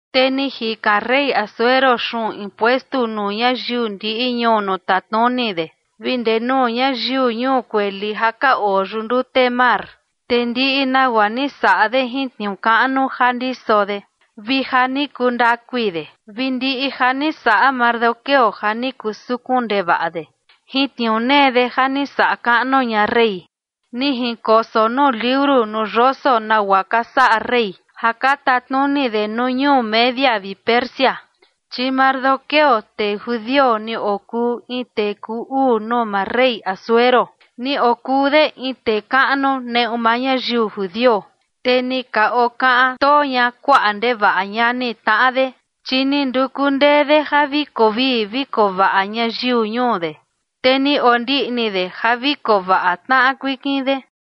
Te ni jikan rey Asuero xuꞌun impuestu nuu ñayiu ndiꞌi ñuu nuu tatnuni de, vi ndee nuu ñayiu ñuu kueli ja ka oo yuꞌu ndute mar. Te ndiꞌi nagua ni saꞌa de jin tniuu kaꞌnu ja ndiso de vi ja ni kuu ndakui de, vi ndiꞌi ja ni saꞌa Mardoqueo ja ni kuu sukun ndevaꞌa de jin tniuu nee de, ja ni saꞌa kaꞌnu ña rey, ni jinkoso nuu liuru nuu yoso nagua ka saꞌa rey ja ka tatnuni de nuu ñuu Media vi Persia. Chi Mardoqueo, tee judio, ni okuu in tee kuu uu nuu maa rey Asuero, ni okuu de in tee kaꞌnu neꞌu maa ñayiu judio, te ni ka okaꞌan too ña kuaꞌa ndevaꞌa ñani tnaꞌa de, chi ni nduku ndee de ja vi koo vii vi koo vaꞌa ñayiu ñuu de, te ni ondiꞌni de ja vi koo vaꞌa tnaꞌa kuikin de.